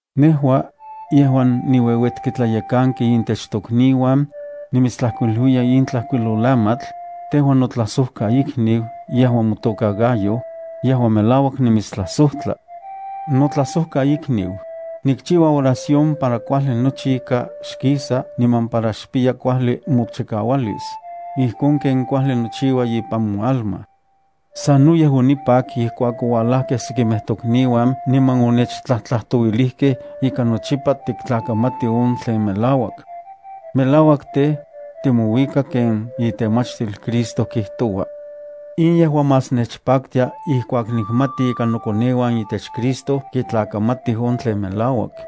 Nejua, yejuan niueuetki tlayekanki intech tokniuan, nimitstlajkuiluiya in tlajkuilolamatl, tejua notlajsojkaikniu yejuan motokan Gayo, yejuan melauak nimitstlajsojtla. Notlajsojkaikniu, nikchiua oración para kuajli nochi ika xkisa niman para xpiya kuajli mochikaualis, ijkon ken kuajli nochiua ipan moalma. Sanoyej onipak ijkuak oualajkej sekimej tokniuan niman onechtlajtlajtouilijkej ika nochipa tiktlakamati on tlen melauak. Melauak tej, timouika ken itemachtil Cristo kijtoua. In yejua más nechpaktia ijkuak nikmati ika nokoneuan itech Cristo kitlakamatij on tlen melauak.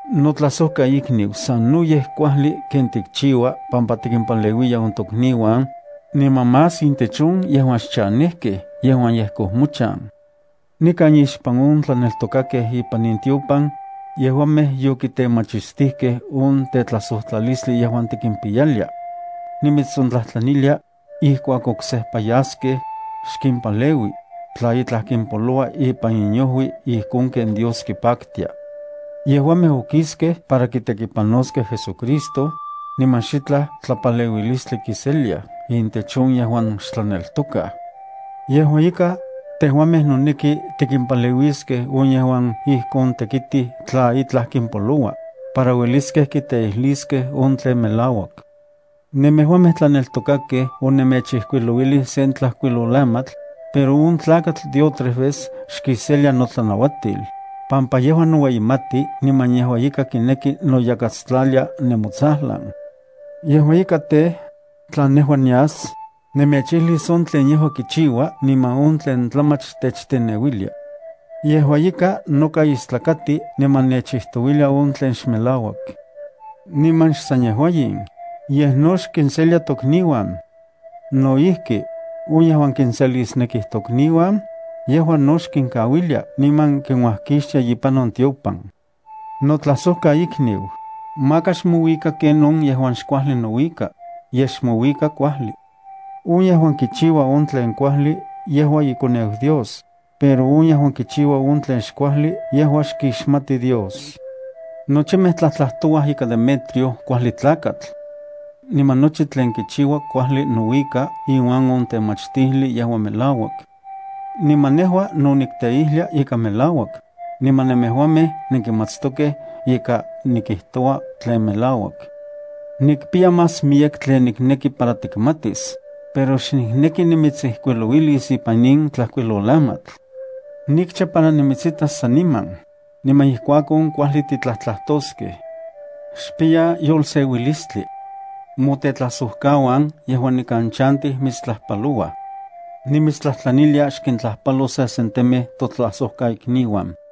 Notlajsojkaikniu, sanoyej kuajli ken tikchiua pampa tikimpaleuiya on tokniuan, niman más intech on yejuan xchanejkej yejuan yejkoj mochan. Nikan ixpan on tlaneltokakej ipan in tiopan, yejuamej yokitemachistijkej on tetlajsojtlalistli yejuan tikimpiyalia. Nimitsontlajtlanilia, ijkuak oksejpa yaskej, xkimpaleui, tla itlaj kimpoloua ipan inojui ijkon ken Dios kipaktia. Yejuamej okiskej para kitekipanoskej JesuCristo, niman xitlaj tlapaleuilistli kiseliaj intech on yejuan xtlaneltokaj. Yejua ika, tejuamej noneki tikimpaleuiskej on yejuan ijkon tekitij tla itlaj kimpoloua, para ueliskej kiteijliskej on tlen melauak. Nemejuamej tlaneltokakej onemechijkuilouilij sen tlajkuilolamatl, pero on tlakatl Diótrefes xkiselia notlanauatil, pampa yejua noueyimati niman yejua ika kineki noyakatstlalia nemotsajlan. Yejua ika tej, tla nejua nias, nemechijlis on tlen yejua kichiua niman on tlen tlamach techteneuilia. Yejua noka istlakati niman nechijtouilia on tlen xmelauak. Niman xsan yejua in, yejua no xkinselia tokniuan. No ijki, on yejuan kinselisnekij tokniuan, yejua no xkinkauilia niman kinuajkixtia ipan on tiopan. Notlajsojkaikniu, maka xmouika ken on yejuan xkuajli nouika, yej xmouika kuajli. On yejuan kichiua on tlen kuajli yejua ikoneu Dios, pero on yejuan kichiua on tlen xkuajli yejua xkixmati Dios. Nochimej tlajtlajtouaj ika Demetrio kuajli tlakatl. Niman nochi tlen kichiua kuajli nouika iuan on temachtijli yejuan melauak. Niman nejua no nikteijlia ika melauak, niman nemejuamej nenkimatstokej ika nikijtoua tlen melauak. Nikpiya más miyek tlen nikneki para tikmatis, pero xnikneki nimitsijkuilouilis ipan in tlajkuilolamatl. Nikcha para nimitsitas saniman, niman ijkuakon kuajli titlajtlajtoskej. Xpiya yolseuilistli. Motetlajsojkauan yejuan nikan chantij mitstlajpalouaj. Nimitstlajtlanilia, xkintlajpalo sesentemej totlajsojkaikniuan.